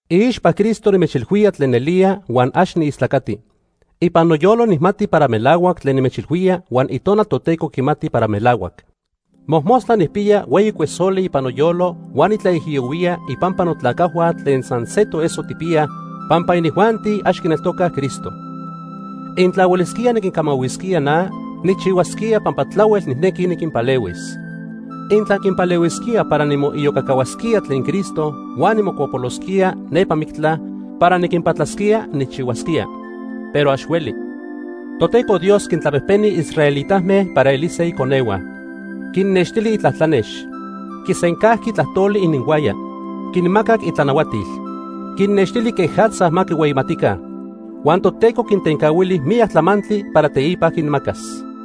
Iixpa Cristo nimechilhuía tlen nelía, huan ax niistlacati. Ipan noyolo nijmati para melahuac tlen nimechilhuía huan Itonal Toteco quimati para melahuac. Mojmostla nijpiya hueyi cuesoli ipan noyolo huan nitlaijiyohuía ipampa notlacajhua tlen san se toeso tijpiyaj, pampa inijuanti ax quineltocaj Cristo. Intla huelisquía niquinmanahuisquía na, nijchihuasquía pampa tlahuel nijnequi niquinpalehuis. Intla quinpalehuisquía para nimoiyocacahuasquía tlen Cristo huan nimocuapolosquía nepa mictla para niquinpatlasquía, nijchihuasquía. Pero ax hueli. Toteco Dios quintlapejpeni israelitame para elise iconehua. Quinnextili itlatlanex. Quisencajqui tlajtoli ininhuaya. Quinmacac itlanahuatil. Quinnextili quejatza ma quihueyimatica. Huan Toteco quintencahuili miyac tlamantli para teipa quinmacas.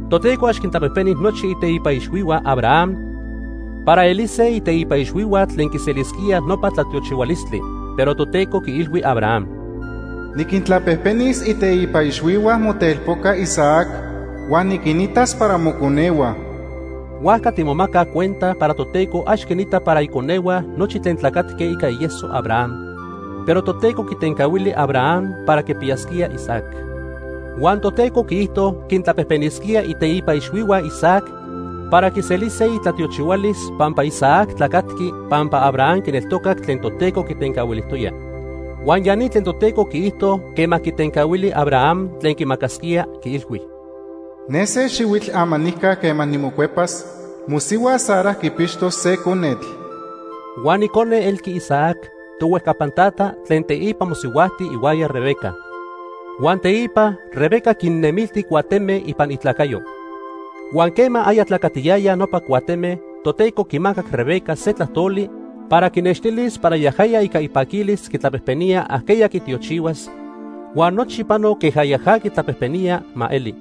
Toteco ax quintlapejpeni nochi iteipa ixhuihua Abraham para elise iteipa ixhuihua tlen quiselisquíaj nopa tlatiochihualistli. Pero Toteco quiilhui Abraham: “Niquintlapejpenis iteipa ixhuihua motelpoca Isaac huan niquinitas para moconehua.” Huajca timomacaj cuenta para Toteco ax quinita para iconehua nochi tlen tlacatque ica ieso Abraham. Pero Toteco quitencahuili Abraham para quipiyasquía Isaac. Huan Toteco quiijto quintlapejpenisquía iteipa ixhuihua Isaac para quiselise itlatiochihualis pampa Isaac tlacatqui pampa Abraham quineltocac tlen Toteco quitencahuilijtoya. Huan ya ni tlen Toteco quiijto quema quitencahuili Abraham tlen quimacasquía, quiilhui: “Ne se xihuitl amanijca quema nimocuepas, mosihua Sara quipixtos se conetl.” Huan icone elqui Isaac, tohuejcapan tata, tlen teipa mosihuajti ihuaya Rebeca. Huan teipa Rebeca quinnemilti cuateme ipan itlacayo. Huan quema aya tlacatiyayaj nopa cuateme, Toteco quimacac Rebeca se tlajtoli para quinextilis para yajaya ica ipaquilis quitlapejpenía ajqueya quitiochihuas, huan nochi pano queja yaja quitlapejpenía ma eli.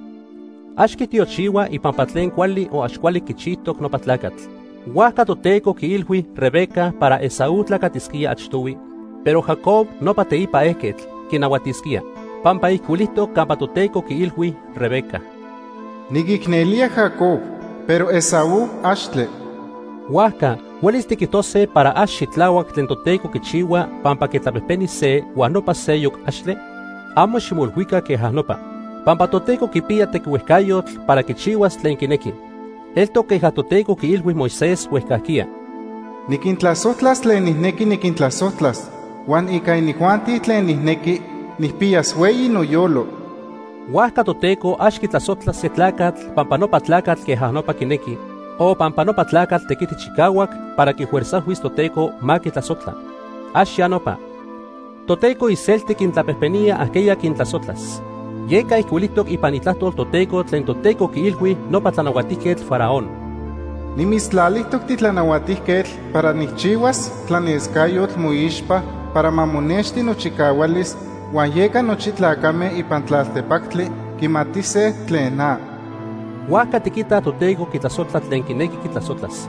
Ax quitiochihua ipampa tlen cuali o ax cuali quichijtoc nopa tlacatl. Huajca Toteco quiilhui Rebeca para Esaú tlacatisquía achtohui, pero Jacob, nopa teipa ejquetl, quinahuatisquía. Pampa ijcuilijtoc campa Toteco quiilhui Rebeca: “Niquicnelía Jacob, pero Esaú, axtle.” Huajca ¿huelis tiquijtose para ax xitlahuac tlen Toteco quichihua pampa quitlapejpeni se huan nopa seyoc, axtle? Amo ximoilhuica queja nopa. Pampa Toteco quipiya tequihuejcayotl para quichihuas tlen quinequi. Eltoc queja Toteco quiilhui Moisés huejcajquiya: “Niquintlasojtlas tlen nijnequi niquintlasojtlas, huan ica inijuanti tlen nijnequi, nijpiyas hueyi noyolo.” Huajca Toteco ax quitlasojtla se tlacatl pampa nopa tlacatl queja nopa quinequi, o pampa nopa tlacatl tequiti chicahuac para quifuerzajhuis Toteco ma quitlasojtla. ¡Ax ya nopa! Toteco iselti quintlapejpenía ajqueya quintlasojtlas. Yeca ijcuilijtoc ipan Itlajtol Toteco tlen Toteco quiilhui nopa Tlanahuatijquetl Faraón: “Nimitztlalijtoc titlanahuatijquetl para nijchihuas tlanescayotl moixpa para ma monexti nochicahualis huan yeca nochi tlacame ipan tlaltepactli quimatise tlen na.” Huajca tiquitaj Toteco quitlasojtla tlen quinequi quitlasojtlas.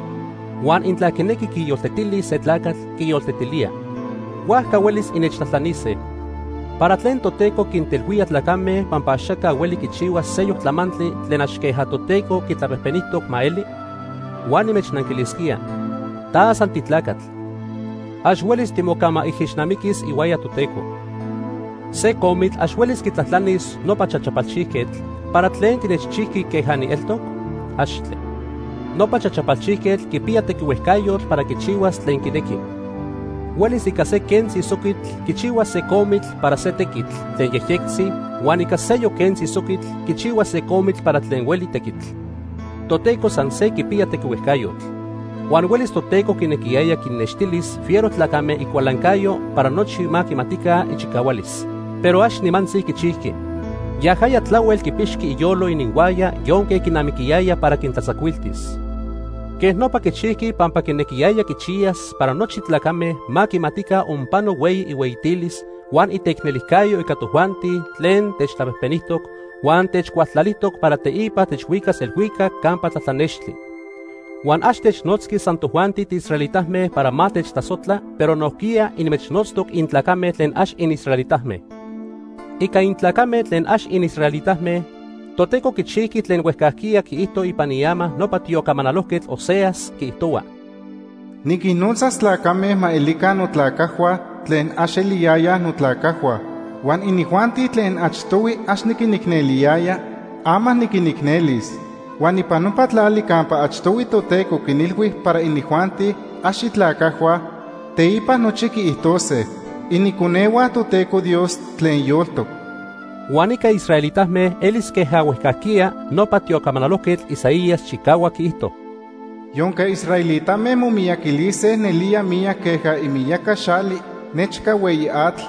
Huan intla quinequi quiyoltetilis se tlacatl, quiyoltetilía. Huajca huelis innechtlajtlanise: “¿Para tlen Toteco quintelhuía tlacame pampa axaca hueli quichihua seyoc tlamantli tlen ax queja Toteco quitlapejpenijtoc ma eli?” Huan nimechnanquilisquía: Ta san titlacatl. Ax huelis timocamaijixnamiquis ihuaya Toteco. Se comitl ax huelis quitlajtlanis nopa chachapalchijquetl: “¿Para tlen tinechchijqui queja nieltoc?” ¡Axtle! Nopa chachapalchijquetl quipiya tequihuejcayotl para quichihuas tlen quinequi. Huelis ica se quentzi soquitl quichihuas se comitl para se tequitl tlen yejyectzi huan ica seyoc quentzi soquitl quichihuas se comitl para tlen hueli tequitl. Toteco san se quipiya tequihuejcayotl. Huan huelis Toteco quinequiyaya quinnextilis fiero tlacame icualancayo para nochi ma quimatica ichicahualis, pero ax nimantzi quichijqui. Yajaya tlahuel quipixqui iyolo ininhuaya yonque quinamiquiyaya para quintlatzacuiltis. Quej nopa quichijqui pampa quinequiyaya quichiyas para nochi tlacame ma quimatica onpano hueyi ihueyitilis, huan iteicnelijcayo ica tojuanti tlen techtlapejpenijtoc, huan techcualtlalijtoc para teipa techhuicas elhuicac campa tlatlanextli. Huan ax technotzqui san tojuanti tiisraelitame para ma techtlasojtla, pero nojquiya inmechnotztoc intlacame tlen ax inisraelitame. Ica intlacame tlen ax inisraelitame, Toteco quichijqui tlen huejcajquiya quiijto ipan iama nopa tiocamanalojquetl Oseas. Quiijtohua: “Niquinnotzas tlacame ma elica notlacajhua tlen ax eliyayaj notlacajhua. Huan inijuanti tlen achtohui ax niquinicneliyaya, ama niquinicnelis. Huan ipan nopa tlali campa achtohui Toteco quinilhui para inijuanti ax itlacajhua, teipa nochi quiijtose: ‘Iniconehua Toteco Dios tlen yoltoc.’” Huan ica israelitame elis queja huejcajquiya nopa tiocamanalojquetl Isaías chicahuac quiijto: “Yonque israelitame momiyaquilise nelía miyac queja imiyaca xali nechca hueyi atl,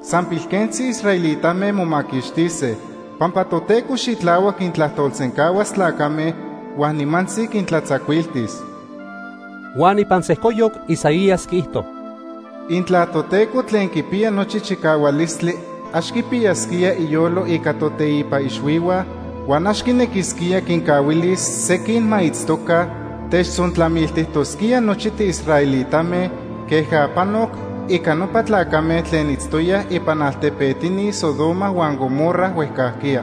san pilquentzi israelitame momaquixtise. Pampa Toteco xitlahuac quintlajtolsencahuas tlacame huan nimantzi quintlatzacuiltis.” Huan ipan sejcoyoc Isaías quiijto: “Intla Toteco tlen quipiya nochi chicahualistli ax quipiyasquía iyolo ica toteipa ixhuihua, huan ax quinequisquía quincahuilis sequin ma itztoca, techtzontlamiltijtosquía nochi tiisraelitame queja panoc ica nopa tlacame tlen itztoyaj ipan altepetini Sodoma huan Gomorra huejcajquiya.”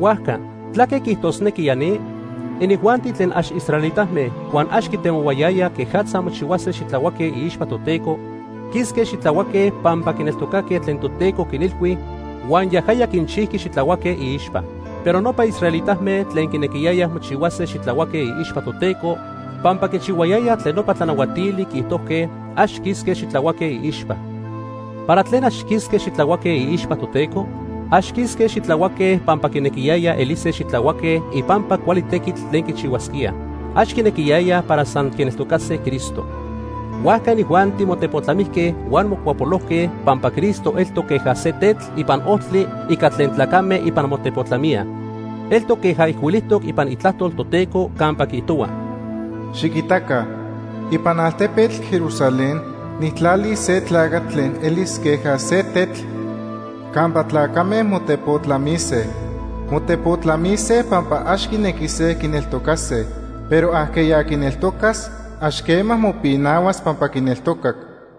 Huajca ¿tlaque quiijtosnequi ya ni? Inijuanti tlen ax israelitame huan ax quitemohuayayaj quejatza mochihuase xitlahuaque iixpa Toteco, quisque xitlahuaque pampa quineltocaque tlen Toteco quinilhui huan yajaya quinchijqui xitlahuaque iixpa. Pero nopa israelitame tlen quinequiyayaj mochihuase xitlahuaque iixpa Toteco pampa quichihuayayaj tlen nopa tlanahuatili quiijtojque, ax quisque xitlahuaque iixpa. ¿Para tlen ax quisque xitlahuaque iixpa Toteco? Ax quisque xitlahuaque pampa quinequiyayaj elise xitlahuaque ipampa cuali tequitl tlen quichihuasquíaj. Ax quinequiyayaj para san quineltocase Cristo. Huajca inijuanti motepotlamijque huan mocuapolojque pampa Cristo eltoc queja se tetl ipan ojtli ica tlen tlacame ipan motepotlamíaj. Eltoc queja ijcuilijtoc ipan Itlajtol Toteco campa quiijtohua: “Xiquitaca, ipan altepetl Jerusalén nijtlalis se tlacatl tlen elis queja se tetl campa tlacame motepotlamise. Motepotlamise pampa ax quinequise quineltocase, pero ajqueya quineltocas ax quema mopinahuas pampa quineltocac.”